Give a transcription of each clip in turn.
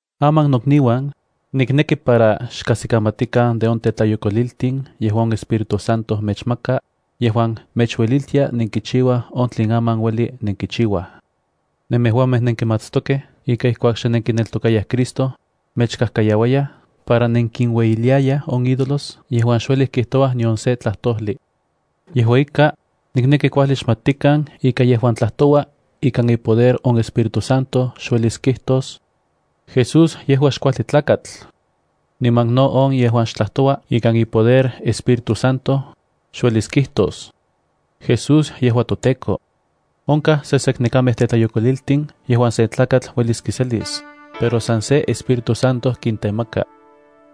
Aman nokniuan, nikneki para xkajsikamatikan de on tetlayokoliltin yejuan on Espíritu Santo mechmaka yejuan mechueliltia nenkichiuaj on tlen aman ueli nenkichiuaj. Nemejuamej nenkimatstokej ika ijkuak xe nenkineltokayaj Cristo, mechkajkayauayaj para nenkiueyiliayaj on ídolos yejuan xuelij kijtouaj nion se tlajtojli. Yejua ika, nikneki kuajli xmatikan ika yejuan tlajtoua ikan ipoder on Espíritu Santo xuelis kijtos: “¡Jesús yejua xkuajli tlakatl!” Niman no on yejuan xtlajtoua ikan ipoder Espíritu Santo, xuelis kijtos: “¡Jesús yejua toTEKO!” Onkaj seseknekamej tetlayokoliltin yejuan sen tlakatl uelis kiselis, pero san se Espíritu Santo kintemaka.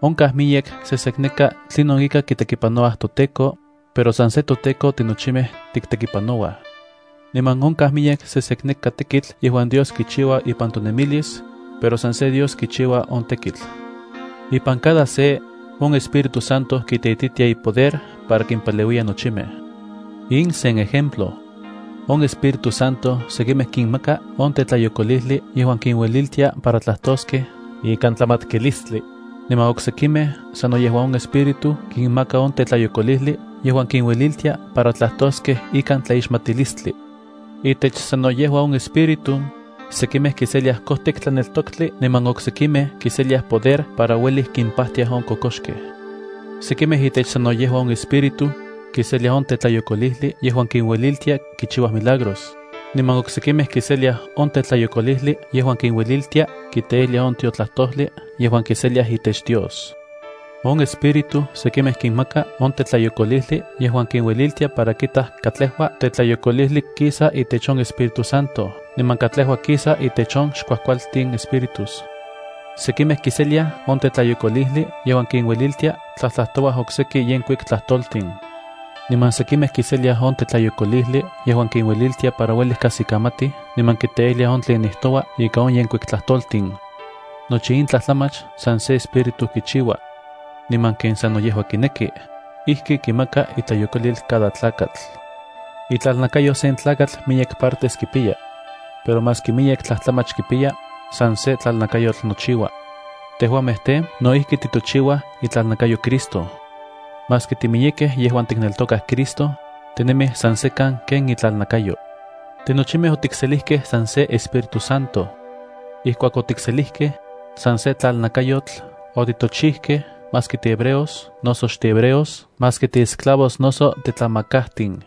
Onkaj miyek sesekneka tlinon ika kitekipanouaj toTEKO, pero san se toTEKO tinochimej tiktekipanouaj. Niman onkaj miyek sesekneka tekitl yejuan Dios kichiua ipan tonemilis, pero san se Dios kichiua on tekitl. Ipan cada se, on Espíritu Santo kiteitita ipoder para kimpaleuiya nochimej. In sen ejemplo. On Espíritu Santo sekimej kinmaka on tetlayokolijli yejuan kinueliltia para tlajtoskej ikan tlamatkilistli, niman oksekimej sano yejua on Espíritu kinmaka on tetlayokolijli yejuan kinueliltia para tlajtoskej ikan tlaixmatilistli. Itech sano yejua on Espíritu, sekimej kiseliaj kojtik tlaneltoktli, niman oksekimej kiseliaj poder para uelij kimpajtiaj on kokoxkej. Sekimej itech sano yejua on Espíritu, kiseliaj on tetlayokolijli yejuan kinueliltia kichiuaj milagros, niman oksekimej kiseliaj on tetlayokolijli yejuan kinueliltia kiteijliaj on tiotlajtojli yejuan kiseliaj itech Dios. On Espíritu sekimej kinmaka on tetlayokolijli yejuan kinueliltia para kitaj katlejua tetlayokolijli kisa itech on Espíritu Santo niman katlejua kisa itech on xkuajkualtin espíritus. Sekimej kiseliaj on tetlayokolijli yejuan kinueliltia tlajtlajtouaj okseki yenkuik tlajtoltin. Niman sekimej kiseliaj on tetlayokolijli yejuan kinueliltia para uelij kajsikamatij niman kiteijliaj on tlen nijtoua ikan on yenkuik tlajtoltin. Nochi in tlajtlamach san se Espíritu kichiua. Niman ken sano yejua kineki, ijki kimaka itlayokolil cada tlakatl. Itlalnakayo sen tlakatl miyek partes kipiya. Pero maski miyek tlajtlamach kipiya, san se tlalnakayotl nochiuaj. Tejuamej tej, no ijki titochiuaj itlalnakayo Cristo. Maski timiyekej yejuan tikneltokaj Cristo, tinemij san sekan ken itlalnakayo. Tinochimej otikselijkej san se Espíritu Santo. Ijkuak otikselijkej, san se tlalnakayotl otitochijkej maski tihebreos noso xtihebreos, maski tiesclavos noso titlamakajtin.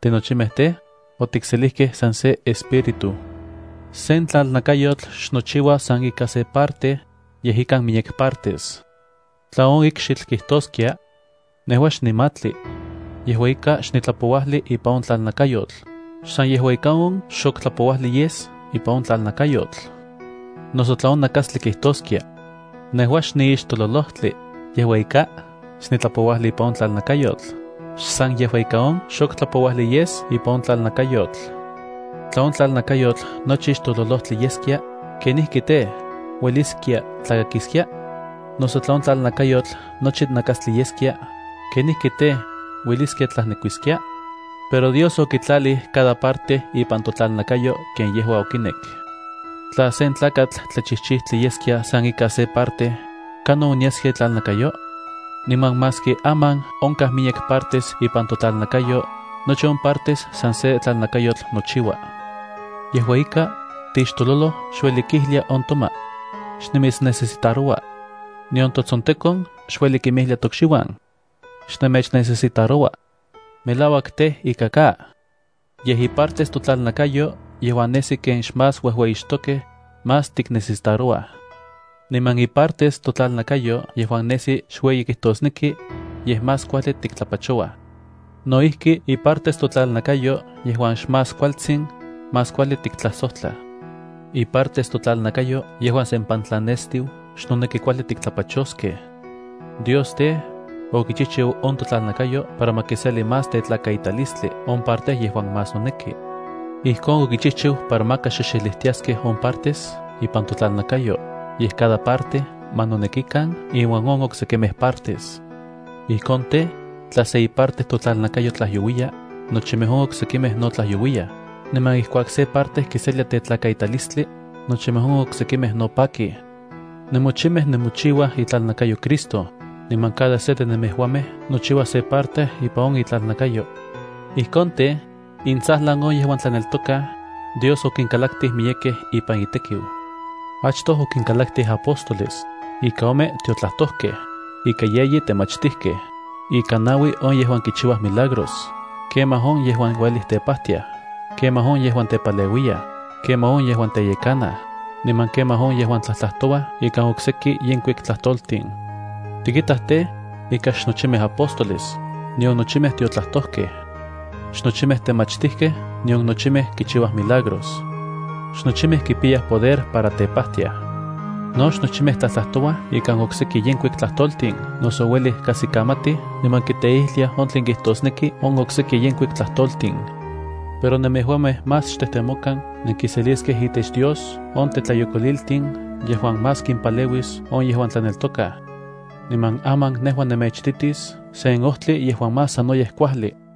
Tinochimej tej, otikselijkej san se Espíritu. Sen tlalnakayotl xnochiua san ika se parte, yej ikan miyek partes. Tla on ikxitl kijtoskia: “Nejua xnimatli, yejua ika xnitlapouajli ipan on tlalnakayotl”, xsan yejua ika on xok tlapouajli yes ipan on tlalnakayotl. Noso tla on nakastli kijtoskia: “Nejua xniixtololojtli, yejua ika xnitlapouajli ipan on tlalnakayotl”, xsan yejua ika on xok tlapouajli yes ipan on tlalnakayotl. Tla on tlalnakayotl nochi ixtololojtli yeskia, ¿kenijki tej, ueliskia tlakakiskia? Noso tla on tlalnakayotl nochi nakastli yeskia, ¿kenijki tej, ueliskia tlajnekuiskiaj? Pero Dios okitlalij cada parte ipan totlalnakayo ken yejua okinek. Tla sen tlakatl tlachijchijtli yeskia san ika se parte, ¿kanon onyaskia itlalnakayo? Niman maski aman onkaj miyek partes ipan totlalnakayo, nochi on partes san se tlalnakayotl nochiuaj. Yejua ika, tixtololoj xueli kijlia on toma: “Xnimitsnecesitaroua.” Nion totsontekon xueli kinmijlia tokxiuan: “Xnenmechnecesitaroua.” Melauak tej, ika ka. Yej ipartes totlalnakayo yejuan nesi ken xmás uejueyixtokej, más tiknecesitarouaj. Niman ipartes totlalnakayo yejuan nesi xueyi kijtosneki, yej más kuajli tiktlapachouaj. No ijki ipartes totlalnakayo yejuan xmás kualtsin, más kuajli tiktlasojtla. Ipartes totlalnakayo yejuan sempantlan nestiu xnoneki kuajli tiktlapachoskej. Dios tej, okichijchiu on totlalnakayo para ma kiseli más tetlakaitalistli on parte yejuan más noneki. Ijkon okichijchiu para maka xexelijtiaskej on partes ipan totlalnakayo, yej cada parte ma nonekikan inuan on oksekimej partes. Ijkon tej, tla se iparte totlalnakayo tlajyouiya, nochimej on oksekimej no tlajyouiyaj, niman ijkuak se parte kiselia tetlakaitalistli, nochimej on oksekimej no pakij. Nemochimej nemochiuaj itlalnakayo Cristo, niman cada se de nemejuamej nochiua se parte ipan on itlalnakayo. Ijkon tej, intsajlan on yejuan tlaneltokaj, Dios okinkalaktij miyekej ipan itekiu. Achtoj okinkalaktij apóstoles, ika ome tiotlajtojkej, ika yeyi temachtijkej, ika naui on yejuan kichiuaj milagros, kemaj on yejuan uelij tepajtiaj, kemaj on yejuan tepaleuiyaj, kemaj on yejuan teyekanaj, niman kemaj on yejuan tlajtlajtouaj ikan okseki yenkuik tlajtoltin. Tikitaj tej, ika xnochimej apóstoles, nion nochimej tiotlajtojkej. Xnochimej temachtijkej nion nochimej kichiuaj milagros. Xnochimej kipiyaj poder para tepajtiaj. No xnochimej tlajtlajtouaj ikan okseki yenkuik tlajtoltin noso uelij kajsikamatij niman kiteijliaj on tlen kijtosneki on okseki yenkuik tlajtoltin. Pero nemejuamej más xtejtemokan nenkiseliskej itech Dios on tetlayokoliltin yejuan más kimpaleuis on yejuan tlaneltokaj. Niman aman nejua nemechititis sen ojtli yejuan más sanoyej kuajli.